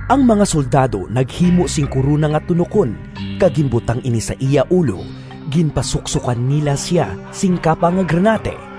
Ang mga soldado naghimo sing korona nga tunokon kag ginbutang ini sa iya ulo; ginpasuksokan nila sia sing kapa nga granate,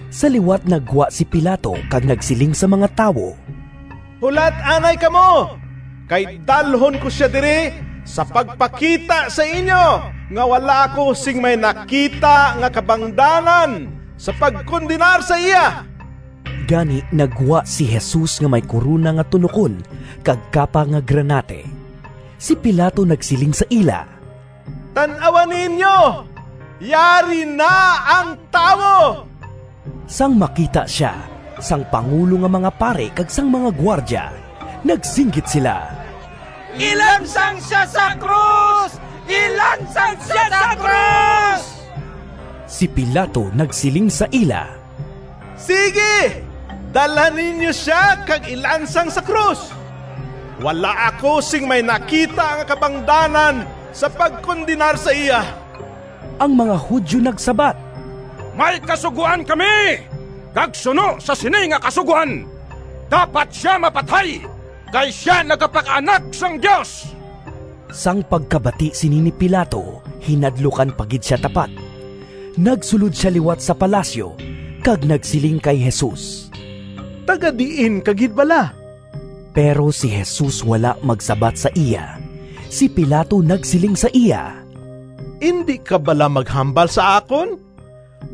Sa liwat naggwa si Pilato kag nagsiling sa mga tawo, “Hulat anay kamo, kay dalhon ko sia diri, sa pagpakita sa inyo nga wala ako sing may nakita nga kabangdanan sa pagkondenar sa iya.” Gani naggwa si Jesus nga may korona nga tunokon kag kapa nga granate. Si Pilato nagsiling sa ila, “Tan-awa ninyo, yari na ang tawo!” Sang makita sia sang pangulo nga mga pari kag sang mga gwardya, nagsinggit sila, “Ilansang sia sa krus! Ilansang sia sa krus!” Si Pilato nagsiling sa ila, “Sigi, dalha ninyo sia kag ilansang sa krus. Wala ako sing may nakita nga kabangdanan sa pagkondenar sa iya.” Ang mga Judio nagsabat, “May kasugoan kami, kag suno sa sini nga kasugoan, dapat sia mapatay, kay sia nagapaka-Anak sang Dios.” Sang pagkabati sini ni Pilato, hinadlukan pa gid sia tapat. Nagsulod sia liwat sa palasyo kag nagsiling kay Jesus, “Taga-diin ka gid bala?” Pero si Jesus wala magsabat sa iya. Si Pilato nagsiling sa iya, “Indi ka bala maghambal sa akon?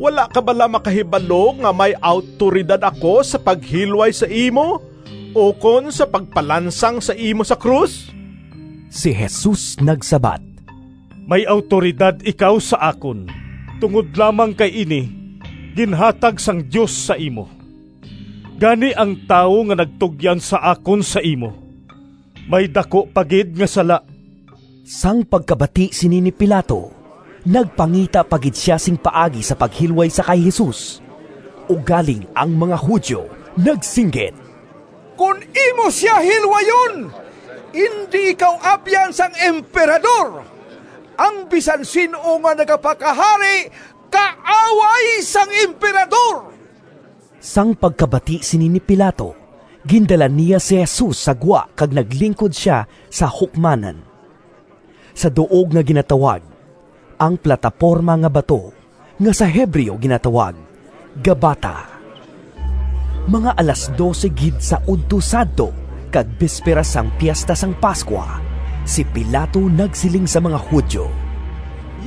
Wala ka bala makahibalo nga may awtoridad ako sa paghilway sa imo ukon sa pagpalansang sa imo sa krus?” Si Jesus nagsabat, “May awtoridad ikaw sa akon tungod lamang kay ini ginhatag sang Dios sa imo. Gani ang tawo nga nagtugyan sa akon sa imo may daku pa gid nga sala.” Sang pagkabati sini ni Pilato nagpangita pa gid sia sing paagi sa paghilway sa kay Jesus. Ugaling ang mga Judio nagsinggit, “Kon imo sia hilwayon, indi ikaw abyan sang Emperador! Ang bisan sin-o nga nagapakahari kaaway sang Emperador!” Sang pagkabati sini ni Pilato, gindala niya si Jesus sa gwa kag naglingkod sia sa hukmanan, sa duog nga ginatawag “Ang Plataporma nga Bato,” nga sa Hebreo ginatawag “Gabbata.” Mga alas dose gid sa udto sadto kag bisperas sang Piesta sang Pascua. Si Pilato nagsiling sa mga Judio,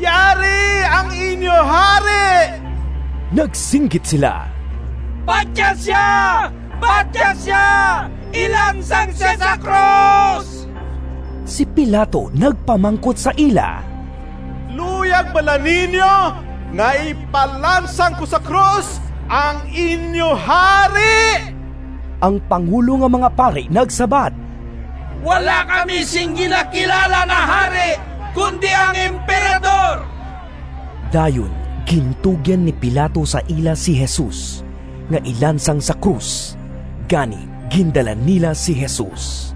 “Yari ang inyo hari!” Nagsinggit sila, “Patya sia! Patya sia! Ilansang sia sa krus!” Si Pilato nagpamangkot sa ila, “Luyag bala ninyo nga ipalansang ko sa krus ang inyo hari?” Ang pangulo nga mga pari nagsabat, “Wala kami sing ginakilala nga hari, kundi ang Emperador!” Dayon gintugyan ni Pilato sa ila si Jesus, nga ilansang sa krus. Gani gindala nila si Jesus.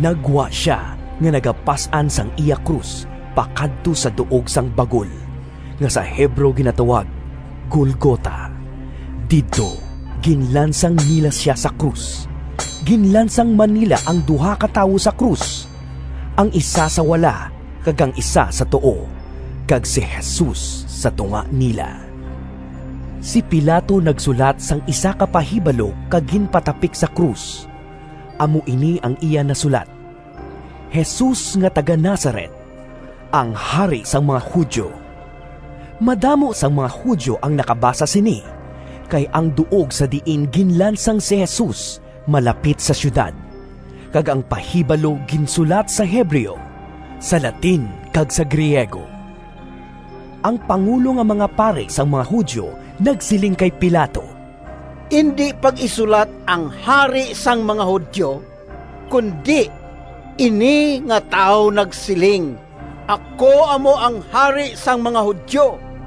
Naggwa sia nga nagapas-an sang iya krus pakadto sa “Duog sang Bagol,” nga sa Hebreo ginatawag “Golgota.” Didto ginlansang nila sia sa krus; ginlansang man nila ang duha ka tawo sa krus, ang isa sa wala kag ang isa sa tuo, kag si Jesus sa tunga nila. Si Pilato nagsulat sang isa ka pahibalo kag ginpatapik sa krus. Amo ini ang iya nasulat: “Jesus nga taga-Nazaret, ang Hari sang mga Judio.” Madamo sang mga Judio ang nakabasa sini, kay ang duog sa diin ginlansang si Jesus malapit sa siyudad, kag ang pahibalo ginsulat sa Hebreo, sa Latin, kag sa Griego. Ang pangulo nga mga pari sang mga Judio nagsiling kay Pilato, “Indi pag-isulat ‘Ang Hari sang mga Judio,’ kundi ‘Ini nga tawo nagsiling, ako amo ang Hari sang mga Judio.’”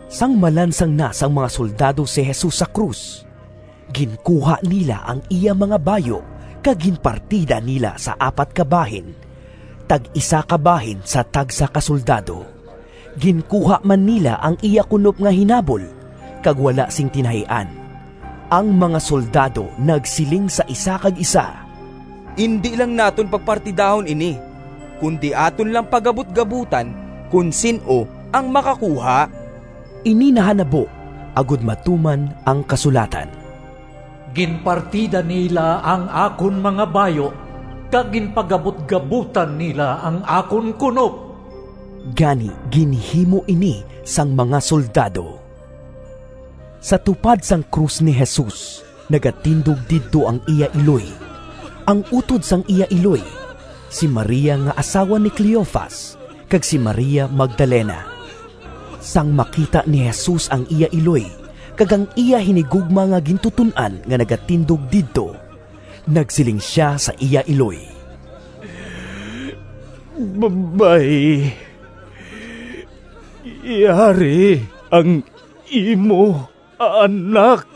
Sang malansang na sang mga soldado si Jesus sa krus, ginkuha nila ang iya mga bayu kag ginpartida nila sa apat ka bahin, tag-isa ka bahin sa tagsa ka soldado. Ginkuha man nila ang iya kunop nga hinabol kag wala sing tinahian. Ang mga soldado nagsiling sa isa kag isa, “Indi lang naton pagpartidahon ini, kundi aton lang pagabutgabotan kon sin-o ang makakuha.” Ini nahanabo agod matuman ang kasulatan: “Ginpartida nila ang akon mga bayu, Kag ginpagabutgabotan nila Ang akon kunop.” Gani ginhimo ini sang mga soldado. Sa tupad sang krus ni Jesus nagatindog didto ang iya iloy, ang utod sang iya iloy, si Maria nga asawa ni Cleofas, kag si Maria Magdalena. Sang makita ni Jesus ang iya iloy kag ang iya hinigugma nga gintuton-an nga nagatindog didto, nagsiling sia sa iya iloy, “Babayi, yari ang imo anak.”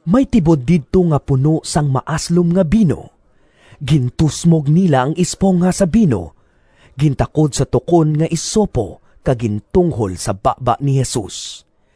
May tibod didto nga puno sang maaslom nga bino. Gintusmog nila ang espongha sa bino, gintakod sa tukon nga isopo kag gintunghol sa baba ni Jesus.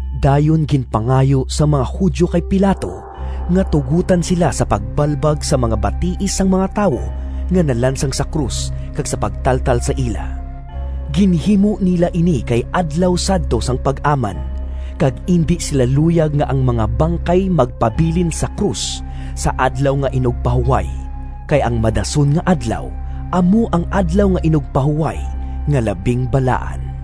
Dayon ginpangayo sang mga Judio kay Pilato nga tugotan sila sa pagbalbag sang mga batiis sang mga tawo nga nalansang sa krus kag sa pagtaltal sa ila. Ginhimo nila ini kay Adlaw sadto sang Pag-aman, kag indi sila luyag nga ang mga bangkay magpabilin sa krus sa Adlaw nga Inugpahuway, kay ang madason nga adlaw amo ang Adlaw nga Inugpahuway nga labing balaan.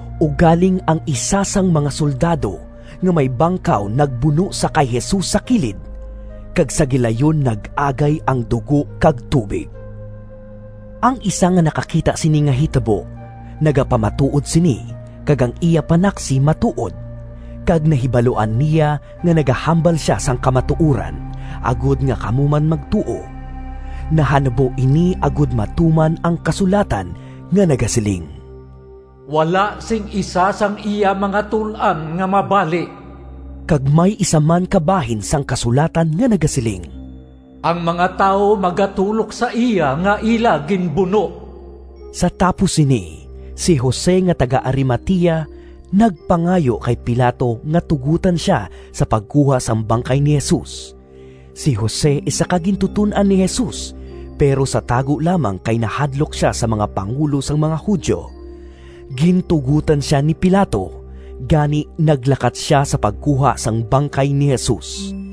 Ugaling ang isa sang mga soldado nga may bangkaw nagbuno sa kay Jesus sa kilid, kag sa gilayon nag-agay ang dugo kag tubig. Ang isa nga nakakita sini nga hitabo nagapamatuod sini; kag ang iya panaksi matuod, kag nahibaluan niya nga nagahambal sia sang kamatuoran, agod nga kamo man magtuo. Nahanabo ini agod matuman ang kasulatan nga nagasiling, “Wala sing isa sang iya mga tul-an nga mabali.” Kag may isa man ka bahin sang kasulatan nga nagasiling, “Ang mga tawo magatulok sa iya nga ila ginbuno.” Sa tapos sini, si Jose nga taga-Arimatea, nagpangayo kay Pilato nga tugotan sia sa pagkuha sang bangkay ni Jesus. (Si Jose isa ka gintuton-an ni Jesus, pero sa tago lamang kay nahadlok sia sa mga pangulo sang mga Judio.) Gintugotan sia ni Pilato, gani naglakat sia sa pagkuha sang bangkay ni Jesus.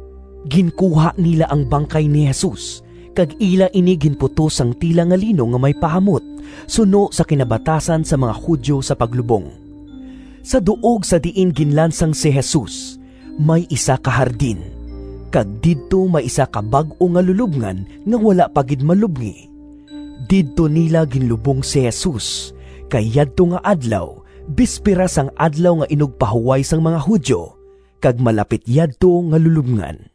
Ginkuha nila ang bangkay ni Jesus kag ila ini ginputos sang tela nga lino nga may pahamot, suno sa kinabatasan sang mga Judio sa paglubong. Sa duog sa diin ginlansang si Jesus, may isa ka hardin, kag didto may isa ka bag-o nga lulobngan nga wala pa gid malubngi. Didto nila ginlubong si Jesus kay yadto nga adlaw bisperas sang Adlaw nga Inugpahuway sang mga Judio, kag malapit yadto nga lulobngan.